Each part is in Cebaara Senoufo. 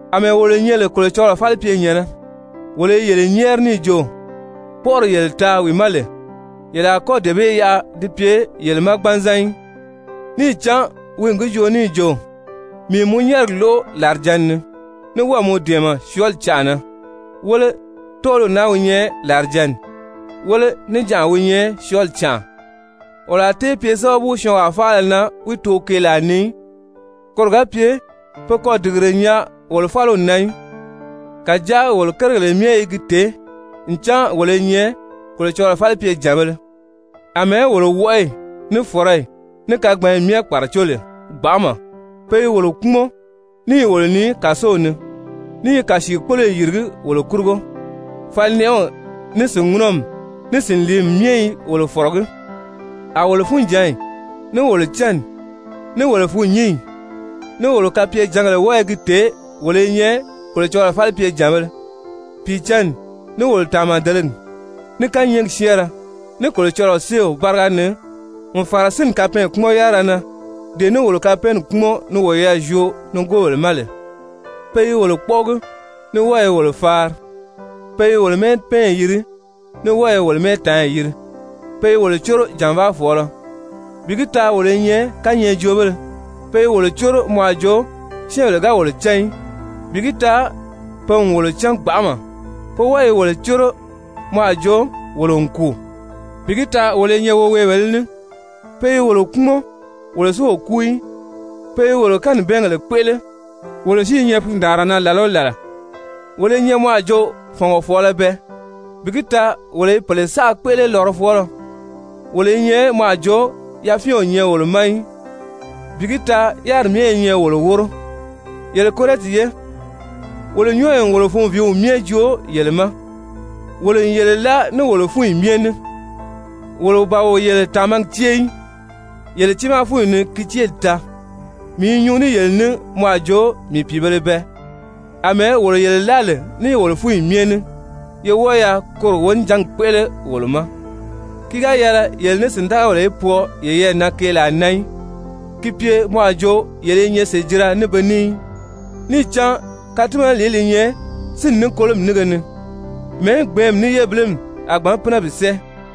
Amɛɛ wolo nyɛ lè Kolocɔlɔɔ falipyenyɛ̀nnɛ, wolo i yele nyɛ́ɛri níì jo kpɔ́ʔɔri yele taa wi ma lè, yele a kɔ́ dee bee yaʔa di pye yele ma gbanzan í. Níì cán wi n gi joo níì jo: «Mii n mɔ nyɛ́ɛrigi lóʔo làrijǎnni ni, ní wɔ́ɔ̀ mɔ dɛ̀ɛmɛ syɔɔli canʔa na.» Wéle, tɔ́ɔliw naa wi nyɛ làrijǎnni, wéle, níjanʔa wi nyɛ syɔɔli canʔa. Wolo a tée pye sábabu syɔɔnwaa faala na wi too keelaa ni í, koro ga pye pe kɔ́ dìgire nyaa wolo fáliw na í. Kàjáa wolo kérigèle myɛ i gi tèé ncan wolo i nyɛ Kolocɔlɔɔ falipyejànbēle, àmɛɛ wolo wɔʔɔyi, ní fɔ̀rɔyi, ní kagbanyi myɛ kpàracó lè gbanʔama. Pe i wolo kpúmɔn, ní i wolo nii kàsow ni, ní i kàsiikpoloyi yìrigí wolo kurugo, falinɛʔɛw, ní sìnŋunɔmi, ní sìnliimi myɛ i wolo fɔ̀rɔgí. A wolo funjǎnyi, ní wolo cánni, ní wolo fûnnyinyi, ní wolo kapyejǎngèle wɔ́ɔ i gi tèé wolo i nyɛ Kolocɔlɔɔ falipyejànbēle, Pìicǎnni, ní wolo tàmadelegi, ní kányɛɛgi syɛ́ɛnrɛ, ní Kolocɔlɔɔ séew báriga ni n fàra sínni kapɛɛnkpumɔn-yárira na dee ní wolo kapɛɛnni kpúmɔn ni woyɛɛ zyoo nigoobèle ma lè. Pe i wolo kpɔ́ʔɔgi ní wɔ́ɔ i wolo faari, pe i wolo mɛ́ɛpɛɛnyi yiri, ní wɔ́ɔ i wolo mɛ́ɛtaanyi yiri. Pe i wolo córo jànvaafɔɔlɔ, bi gi taa wolo i nyɛ kányɛɛjoobéle. Pe i wolo córo mɔ a jo syɛ́ɛnbèle ga wolo cán í, bi gi taa pe n wolo cán gbanʔama. Pe wɔ́ɔ i wolo córo mɔ a jo wolo n kùu, bi gi taa wolo i nyɛ woweebèlē ní. Pe i wolo kpúmɔn, wolo si o kúu í. Pe i wolo kanibɛɛngèle kpéʔele, wolo si i nyɛ fundaanra na làla o làla. Wolo i nyɛ mɔ a jo fɔ̀ngɔfɔɔlɔ bɛɛ, bi gi taa wolo i pèle saʔa kpéʔele lɔrɔfɔɔlɔ. Wolo i nyɛ mɔ a jo yafyɛn o nyɛ wolo ma í, bi gi taa yáriri myɛ i nyɛ wolo wóro. Yele Korɛnti ye, wolo nyɔ́ɔyi n wolo funviiw myɛ joo yele ma. Wolo n yele láa ní wolo fúnyi myɛ ní. Wolo ban wo yele tàmagi cée í, yele tiimaa fúnyi ni ki céeli taa. Mii i nyuu ní yele ní mɔ a jo mii pìibēle bɛɛ, àmɛɛ wolo yele láa lè ní wolo fúnyi myɛ ní, ye wɔ́ɔ yaa koro wonijangi kpéʔele wolo ma! Ki ga yɛlɛ yele ní sìndagabèle í pwɔɔ yeyɛɛ na keelaa na í, ki pye mɔ a jo yele i nyɛ sèjira ní be ní í. Níì cán katimanalìí li nyɛ sínni ní kolomi nínge ni? Mɛ̀ɛ́ gbɛ̀ɛ́nmi ní yébilimi a gbǎn pínɛ bi sɛ́ɛ?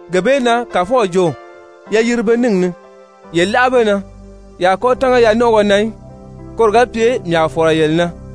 Gee bee na Kàfɔw jo: «Ye yiri be níngi ni, yé láʔa be na. Ye a kɔ́ tánga yanɔnʔɔgɔ na í, koro ga pye mii a fɔ̀lɔ yele na,